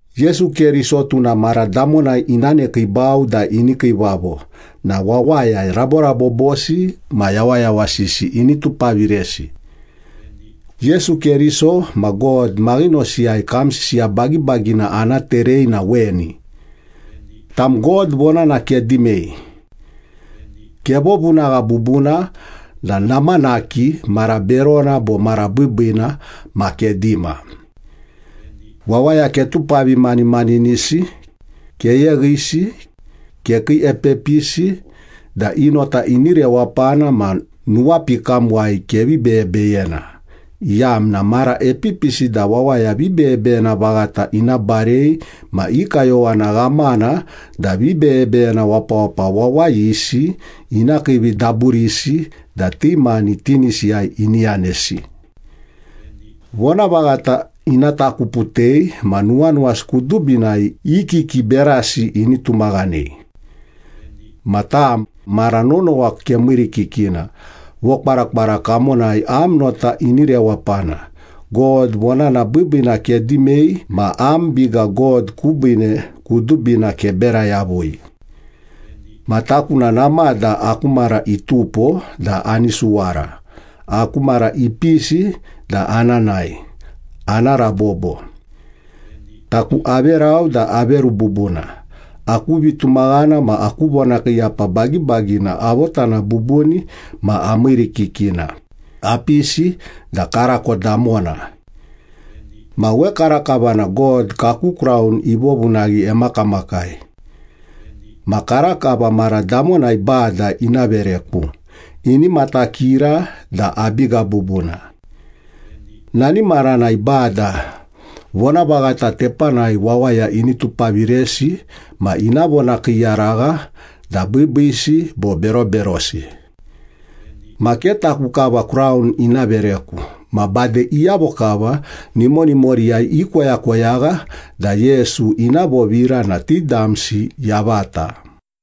Yesu Keriso tuna mara damonai ina nekiibau da ini kiivavo na wawaya raborabobosi ma yawayawasisi ini tupaviresi. Yesu Keriso ma God maghinosiyai kam sisiya bagibagina ana terei na weni. Tam, God vonana kedimei. Kevovunagha bubuna da namanaki mara berona bo mara biibiina ma kedima. Wawaya ketupavimanimaninisi, keyeghisi, kekiiepepisi da i nota ini rewapana ma nuwapikamuwai kevi beyebeyena, iyamna mara epipisi da wawaya vibeyebeyena vaghata ina barei ma i kayowana ghamana da vibeyebeyena wapawapa wawayisi ina kiividaburisi da ti mani tinisiyai ini yanesi. Vonavaghata ina takuputei ma nuwanuwasi kudubinai i kiki berasi ini tumaghanei. Ma tam, mara nonowa kemiirikikina, vokwarakwara kamonai am nota ini rewapana, God vonana biibiina kedimei ma am biga God kubiine kudubina kebera yavui. Ma taku na namada aku mara itupo da ani suwara, aku mara ipisi da ana nae, ana rabobo. Taku averau da averu bubuna, aku vitumaghana ma aku vonakiiyapa bagibagina avotana bubuni ma amiirikikina, apisi da karako damona. Ma wekarakava na God kaku kraun ivovunaghi emakamakai. Ma karakava mara damonai Bada ina vereku, ini matakira da abiga bubuna. Nani maranai Bada vonavaghata tepanai wawaya ini tupaviresi ma ina vonakiiyaragha da biibiisi bo beroberosi. Ma ke taku kava kraun ina vereku ma bade iyavo kava nimonimoriyai ikoyakoyagha da Yesu ina vovira na ti damsi yavata.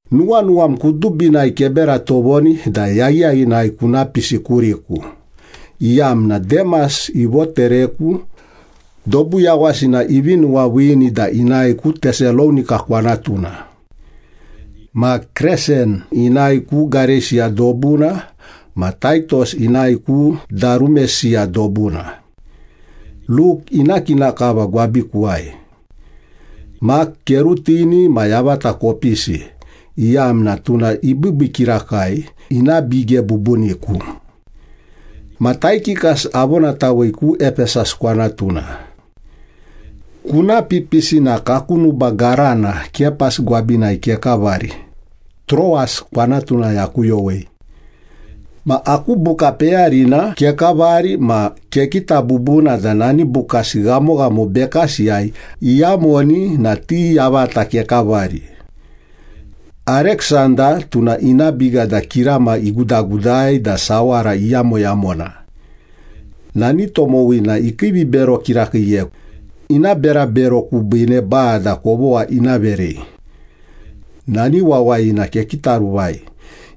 Nuwanuwam kudubinai kebera tovoni da yaghiyaghinai kuna pisi kuriku, iyamna Demas ivotereku, dobu yawasina ivi nuwaviini da inae ku Tesalonika kwanatuna. Ma Kresen inae ku Gareisiya dobuna ma Taitos inae ku Darumesiya dobuna. Luk ina kina kava gwabikuwai. Mak kerutini ma yavata kopisi, iyamna tuna ibiibii kirakai, ina bige bubuniku. Ma Taikikas avonatawei ku Epesas kwanatuna. Kuna pipisi na kaku nuba garana Kapas gwabinai kekavari, Troas kwanatunai akuyowei. Ma aku buka peyarina kekavari ma kekita bubuna da nani bukasi ghamoghamo bekasiyai iyamoni na ti yavata kekavari. Ariksanda, tuna ina biga da kirama egudagudai da sawara eyamoyamona. Nani tomowina ikiivibero kirakiiyeku, ina berabero kubiine Bada kovogha ina verei. Nani wawayina kekitaruvai,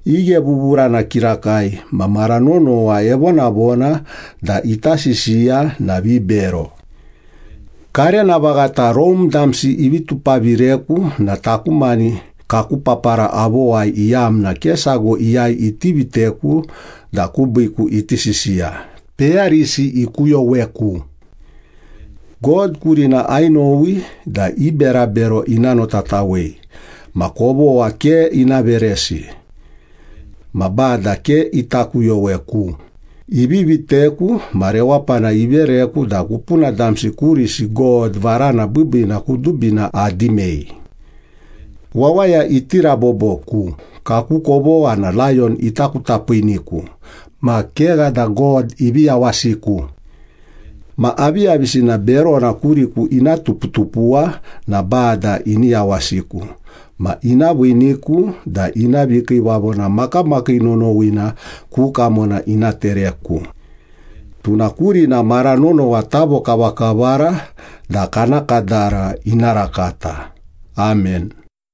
ighevuvurana kirakai ma mara nonowa evonavona da ita sisiya na vibero. Karena vaghata Rome damsi ivi tupavireku na taku mani kaku papara avowai iyamna ke sago iyai iti viteku da kubiiku iti sisiya, peyarisi ikuyoweku. God kurina ainowi da i berabero ina notatawei ma kovogha ke ina veresi. Ma Bada ke ita kuyoweku, ivi viteku ma rewapana ivereku da kupuna damsi kurisi God varana biibiina kudubina adimei. Wawaya iti raboboku, kaku kovogha na layon ita kutapiiniku ma kegha da God ivi yawasiku. Ma aviyavisina berona kuriku ina tuputupuwa na Bada ini yawasiku ma ina viiniku da ina vikiivavona makamakii nonowina ku kamona ina tereku. Tuna kurina mara nonowa tavokavakavara da kana kadara ina rakata! Amen.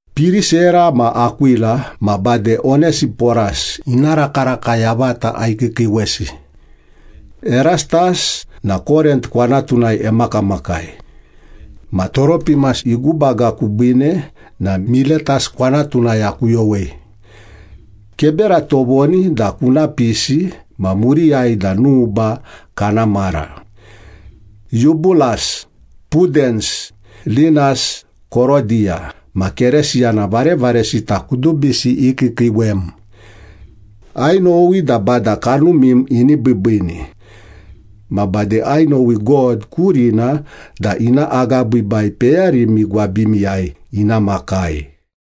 Pirisera ma Akwila ma bade Onesiporas ina rakaraka yavata aikiikiiwesi. Erastas na Korint kwanatunai emakamakai. Ma Toropimas igubaga kubiine na Miletas kwanatunai akuyowei. Kebera tovoni da kuna pisi ma muriyai da nuba kana mara. Yubulas, Pudens, Linas, Korodiya ma Keresiyana varevaresita kudubisi ikiikiiwem. Ainowi da Bada kanumim ini biibiini. Ma bade ainowi God kurina da ina agabiibai peyarimi gwabimiyai ina makai.